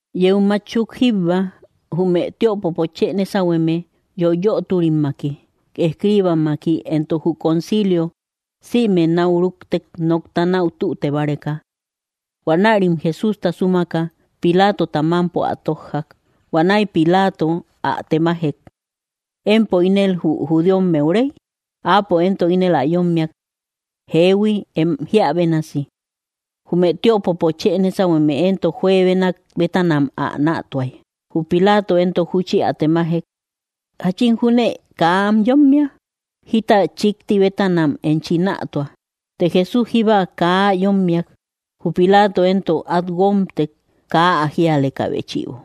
Yeu mátchuk jíbba, jume tiöpopo chë nésauhueme, yoiyöturimmaki, escibammaki, éntok jü concilio, sïme nau rúktek nokta nau tüte báreka. Huanärim Jesústa súmaka, Pilátota mámpo ä tójjak. Huanäi Pilato ä temajek: —¿Empo ínel jü judíomeu rey? Áapo éntok ínel ä yommiak: —Jéehui, em jiä bénasi. Jume tiöpopo chë nésauhueme éntok juebenak bétanam ä nätuai. Jü Pilato entok júchi ä temajek: —¿Jachin júnë kaa am yommia? Jita chikti bétanam enchi nätua. Të Jesús jíba kaa ä yommiak. Jü Pilato éntok at guómtek kaa ä jíalekä béchïbo.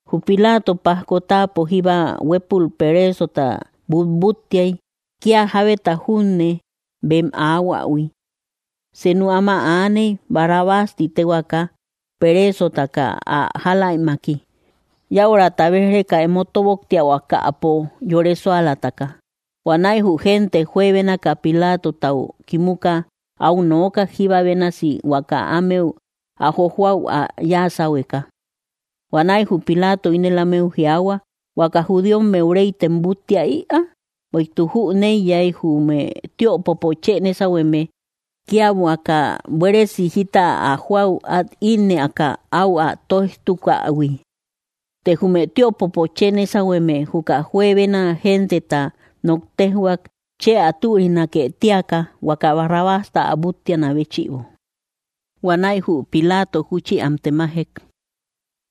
Jü Pilato pajko táapo jíba huépul perésota butbúttiai, kia jábeta junne bem aahuähui. Senu áma aaney Barrabás ti tehuaka, perésotakä ä jáläimmaki; yäurata béj‑reka emo tóboktiahuakäpo yore súalataka. Huanäi jü gente juebénaka Pilátotau kimuka, au nookak jíba bénasi huaka ámeu ä jojóäu ä yáasáuhueka. Huanäi jü Pilato ínel ámeu jiaahua: —¿Huaka judíomeu réytem búttia ïa? Bueïtuk jüneiyai jume tiöpopo chë nésauhueme kia huaka buéresi jita ä jóäu at ínnëaka au ä tóijtukäihui. Të jume tiöpopo chë nésauhueme juka juebena genteta nok téjhuak chë ä türinake tíakä huaka Barrabásta ä búttiana béchïbo. Huanäi jü Pilato júchi am temajek: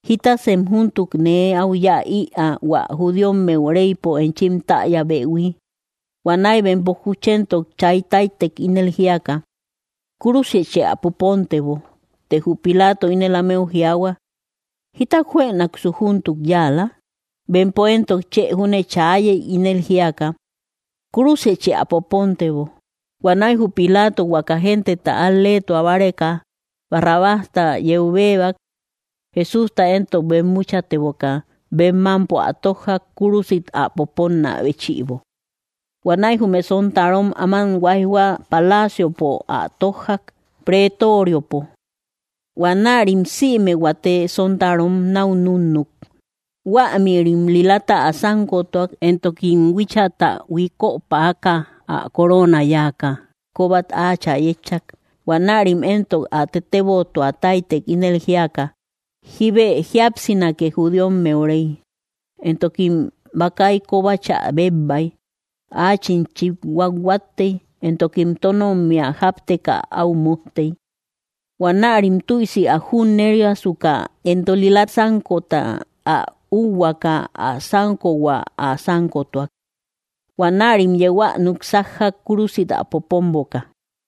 —¿Jítasem júntuk nee au yáa ïa hua judíomeu réïpo enchim täyäbehui? Huanäi bempo juchéntok chaitáitek ínel jíaka: —¡Kúrusichë ä popóntebo! Të jü Pilato ínel ámeu jiaahua: —¿Jita juënaksu júntuk yáala? Bempo éntok chë júne chaayey ínel jíaka: —¡Kúrusichë ä popóntebo! Huanäi jü Pilato huakä genteta al‑leetua báreka, Barrabásta yeu béebak; Jesústa éntok bemmúchateboka, bem mámpo ä tójjak kúrusit ä popónnä béchïbo. Huanäi jume sontaarom áman huaijhua paláciopo ä tójjak, pretoriopo; huanärim sïme huate sontarom nau núnnuk. Huämïrim lilata ä sánkotuak, éntokim huíchata huíköpäaka ä corona yáaka, kóbat áachä yétchak. Huanärim éntok ä tetébotuataitek ínel jíaka: —¡Jíbë jíapsinake judíomeu rey! Éntokim bakai kóbachä bebbai. Achim chithuathuattei, éntokim tónommia jápteka au mujtei. Huanärim tüisi ä junnériasuka éntok lila sánkota ä úhuaaka, ä sánkohua ä sánkotuak. Huanärim yeu ä núk sájjak kúrusit ä popómboka.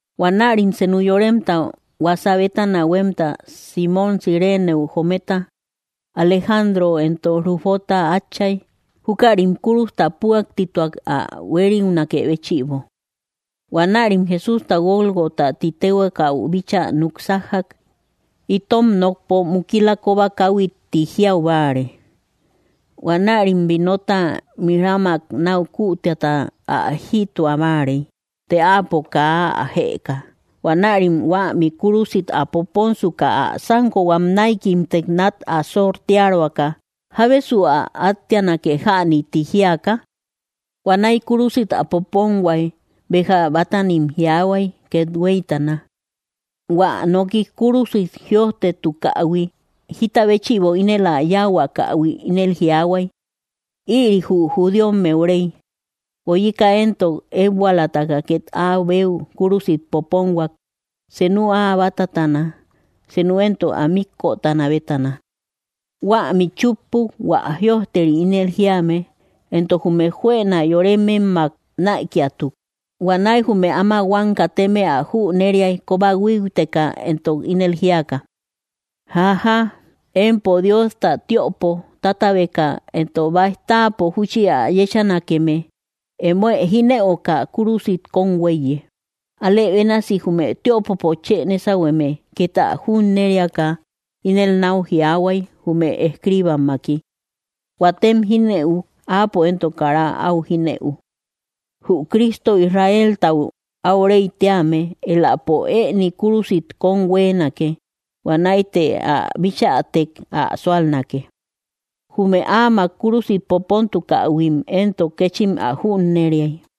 Huanärim senú yoremta huasá bétana huemta, Simmom Cireneu joometa, Alejándro éntok Rúfota atchai, jukarim kúrusta püaktituak ä huériunakë béchïbo. Huanärim Jesústa Gólgota tï tehuakäu bíchaa núk sájjak, itom nokpo Mukila koba kauhui ti jiaubáare. Huanärim vinota mirrámak nau kuutíata ä jïtua báarei, të Áapo kaa ä jëka. Huanärim huämi kúrusit ä popónsuka, ä sánkohuam näikimtek nat ä sortiároaka, jábesu ä átteanake jäni tï jiaka. Huanäi kúrusit ä ponhuái béja bátanim jiaahuay kethuéitana. Huä nooki kúrusit jïojtetukähui jita béchïbo ínel ä yáahuakähui, ínel jiaahuay: “Ïri jü judíomeu Rey.” Guóyika éntok ékbualatakä ket áa beu kúrusit popónhuak, seenu ä batatana, senu éntok ä míkkötana bétana. Huämi chúppuk hua jïojteri ínel jíame: “Éntok jume juëna yórememmak naïkiatuk.” Huanäi jume áma huam kateme ä junneriai koba huíuteka entok ínel jíaka: —Jajáa, empo Diosta tiöpo tátabeka éntok baij táapo júchi ä yéchanakeme, émoë jínëuka. Kúrusit kóm huéiye. Alë bénasi jume tiöpopo chë nésauhueme ket ä junnériaka ínel nau jiaahuay jume escribammaki: —Huatem jínëuk, Áapo éntok kara au jínëu. Jü Cristo, Israéltau au Rey tíame, éläpo ëni kúrusit kóm huéenake, huanäi të ä bichätek ä súalnake. Jume áamak kúrusit popóntukähuim éntok, kéchim ä junneriai.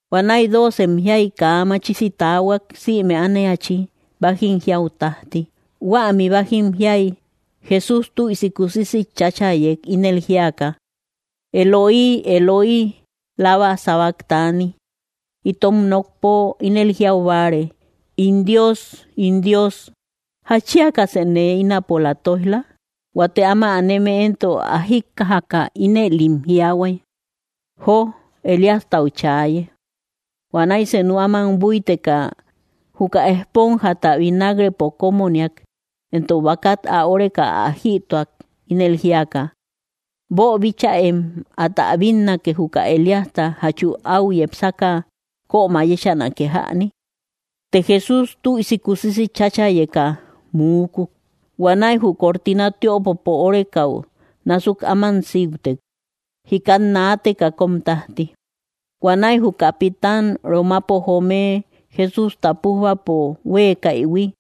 Huanäi dóocem jiai, kaa machisi taahuak sïme ániachi bájim jiäu tajti. Huämi bájim jiai, Jesús tüisi kusisi cháchayek ínel jíaka: —Eloí, Eloí, ¿lama sabaktani? —itom nokpo ínel jiaubáare: In Dios, In Dios, ¿jatchíakasë nee ínapola toijla? Huate áma aneme éntok ä jikkajaka, ínëlim jiaahuay: —Jó, Elíastau chaaye. Huanäi senu áman búiteka, juka espónjata vinágrepo kómoniak, éntok bakat ä óreka ä jïtuak ínel jíaka: —Boobíchäem, átä bínnake juka Elíasta jachu au yepsakä kömä yéchanake jäni. Të Jesús tüisi kusisi chachayeka muúkuk. Huanäi jü cortina tiöpopo órekau násuk áman síutek, jikat naateka kóm tajti. Huanäi jü capitán romapo joome Jesústa pújbapo huekäihui,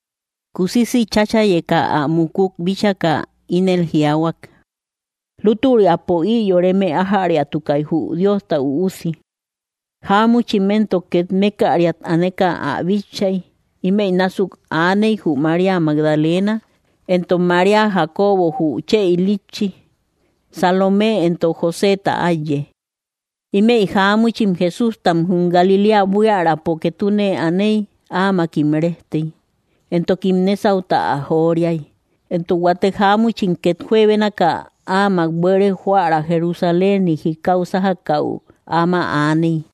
kusisi chachayeka ä mukuk bíchaka, ínel jiaahuak: —Lútüriapo ï yoreme ájäriatukai jü Diosta Üusi. Jaamuchim éntok ket mékkäriat aneka ä bitchai. Ímëi násuk aaney jü María Magdalena, entok María Jacobo jü chë ilitchi, Salomé, éntok Joseta áiye. Ímëi jáamuchim Jesústa jum Galiléa buiärapo ketune anéi áamakim rejtei, éntokim nésauta ä joríai. Éntok huate jáamuchim ket juebenakä áamak buere joära Jerusaléniu jikau sájakäu áma aaney.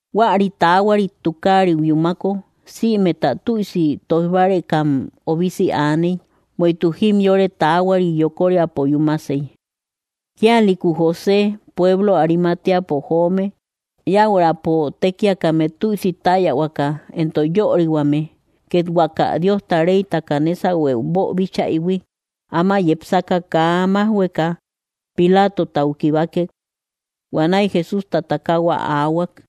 Huäri taahuarit tukariu yúmako, sïmeta tüisi toijbárekam obisi aaney, bueïtuk jimyore taahuari yokoriapo yúmasey. Kíalïku José, pueblo Arimateapo joome, yäuraapo tékiakame tüisi täyahuakä éntok yörihuame. Ket huaka Diosta reytaka nésahueu boobíchaïhui, áma yepsaka, kaa májhueka Pilátotau kibákek; huanäi Jesústa takahua aahuak.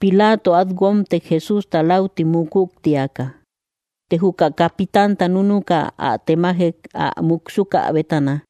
Pilato at guómtek Jesústa lauti mukuk tïaka. Të juka capitanta núnuka, ä temajek ä múksuka bétana.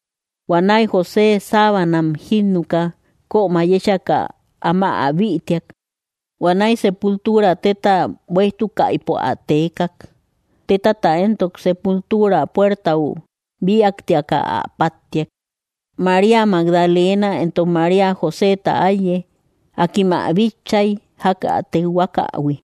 Huanäi José sábanam jínnuka, kömä yéchaka, áma ä bïtiak. Huanäi sépultuura, téta buéjtukaïpo, ä teekak. Tétata éntok sépultuura puertau bíaktiakä ä páttiak. María Magdalena, éntok María Joseta áiye, akim ä bitchai jak ä tekhuakähui.